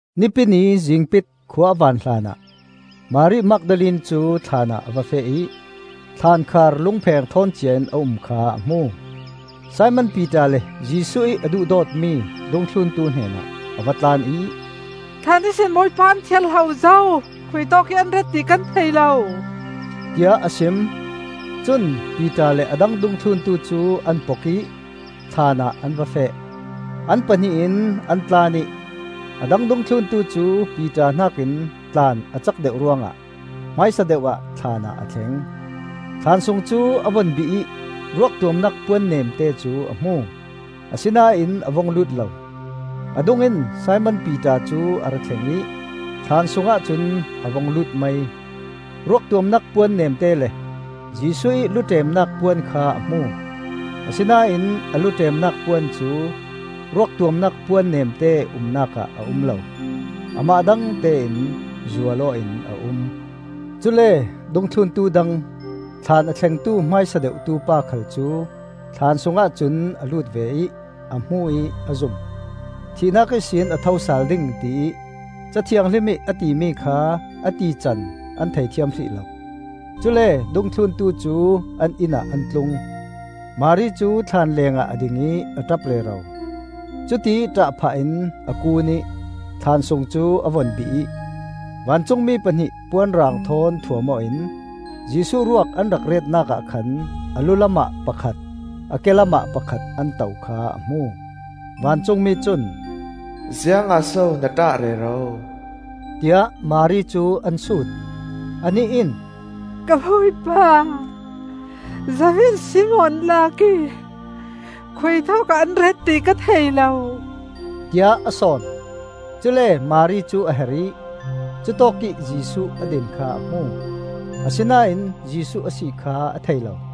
Nipi Ni zingpit khua a van hlanah, Mari Magdalene cu thlaan ah a va feh ih thlaankhar lungpheng ṭhawn cia-in a um kha a hmu. Simon Piter le Jesuh ih a duhdawtmi dungthluntu hnenah a va tlan ih, “Thlaan ihsin Bawipa an thiar hlo zo; khuitawkih an ret ti kan thei lo!” tiah a sim. Cun Piter le a dang dungthluntu cu an pok ih thlaan ah an va feh. An pahnih in an tlan ih a dang dungthluntu cu Piter hnakin tlan a cak deuh ruangah hmaisa deuh ah thlaan ah a thleng. Thlaan sung cu a vun bih ih ruak tuamnak puan nemte cu a hmu, asinain a vung lut lo. A dungin Simon Piter cu a ra thleng ih thlaan sung ahcun a vung lut mai. Ruak tuamnak puan nemte le, Jesuh ih lu ṭemnak puan kha a hmu. Asinain a lu ṭemnak puan cu ruak tuamnak puan nemte umnak ah a um lo; amah dangte in zual aw in a um. Cule dungthluntu dang, thlaan a thlengtu hmaisa deuhtu pa khal cu thlaan sungah cun a lut ve ih a hmu ih a zum. Thihnak ihsin a thosal ding tiih Ca Thianghlim ih a timi kha a tican an thei thiam hrih lo. Cule dungthluntu cu an inn ah an tlung. Mari cu thlaan lengah a ding ih a ṭap rero. Cutiih ṭah phah in a kuun ih thlaan sung cu a vun bih ih, vancungmi pahnih puanrang thawn thuam aw in Jesuh ruak an rak retnak ah khan a lu lamah pakhat, a ke lamah pakhat an to kha a hmu. Vancungmi cun, “Ziangah so na ṭah rero?” tiah Mari cu an sut. Anih in, “Ka Bawipa zo in si maw an lak ih khuitawkah an ret ti ka thei lo,” tiah a sawn. Cule Mari cu a her ih cutawkih Jesuh a din kha a hmu; asinain Jesuh a si kha a thei lo.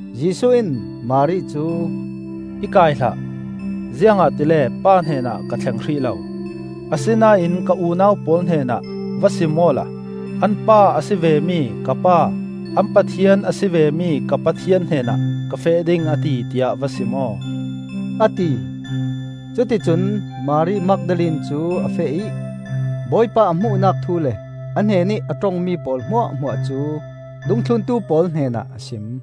Jesuh in Mari cu, “I kai hlah! Ziangahtile Pa hnenah ka thleng hrih lo. Asinain ka unau pawl hnenah va sim awla ‘An Pa a si vemi ka Pa, an Pathian a si vemi ka Pathian hnenah ka feh ding a ti,’ tiah va sim aw,” a ti. Cuti cun Mari Magdalene cu a feh ih Bawipa a hmuhnak thu le a hnenih a ṭongmi pawl hmuahhmuah cu dungthluntu pawl hnenah a sim.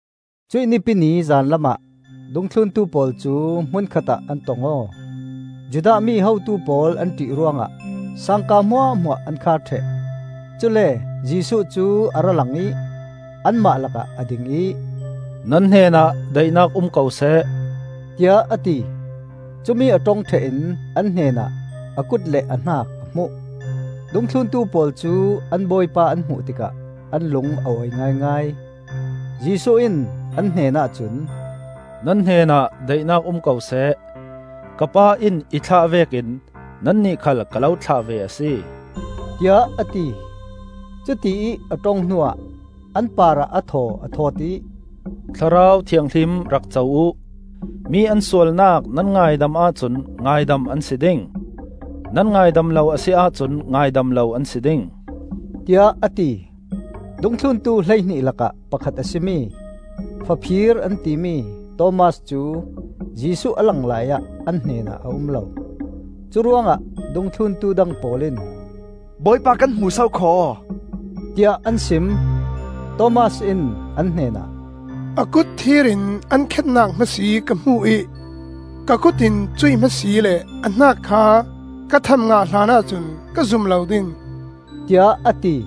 Cuih Nipi ni zanlam ah dungthluntu pawl cu hmunkhatah an tong aw. Judah mi hotu pawl an ṭih ruangah sangka hmuahhmuah an khar ṭheh. Cule Jesuh cu a ra lang ih anmah lakah a ding ih, “Nan hnenah daihnak um ko seh,” tiah a ti. Cumi a ṭong ṭheh in an hnenah a kut le a hnak a hmuh. Dungthluntu pawl cu an Bawipa an hmuh tikah an lung a awi ngaingai. Jesuh in an hnenah cun, “Nan hnenah daihnak um ko seh! Ka Pa in i thlah vekin nannih khal ka lo thlah ve a si,” tiah a ti. Cutiih a ṭong hnuah an parah a thaw a thawt ih, “Thlarau Thianghlim rak co uh! Mi an sualnak nan ngaidam ahcun ngaidam an si ding; nan ngaidam lo a si ahcun ngaidam lo an si ding,” tiah a ti. Dungthluntu hleihnih lakah pakhat a si mi (Faphir an timi) Thomas cu Jesuh a lang laiah an hnenah a um lo. Curuangah dungthluntu dang pawl in, “Bawipa kan hmu sokhaw!” tiah an sim. Thomas in an hnenah, “A kut thir in an khennak hma si ka hmuh ih ka kut in cuih hma si le a hnak kha ka tham ngah hlanah cun ka zum lo ding,” tiah a ti.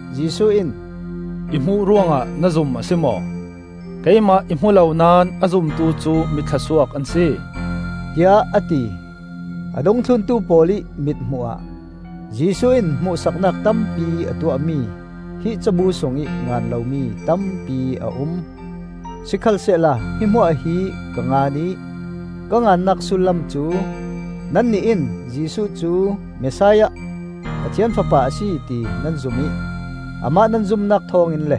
Jesuh in, “I hmuh ruangah na zum a si maw? Keimah i hmu lo naón a zumtu cu mi thlawsuak an si,” tiah a ti. A dungthluntu pawl ih mit hmuhah Jesuh in hmuhsaknak tampi a tuahmi, hi cabu sungih ngan lomi tampi a um. Sikhalsehla hi hmuah hi ka ngan ih ka ngannak sullam cu nannih in Jesuh cu Messiah, Pathian Fapa a si ti nan zum ih amah nan zumnak thawngin le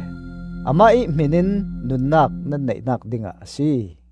amah ih hminin nunnak nan neihnak dingah a si.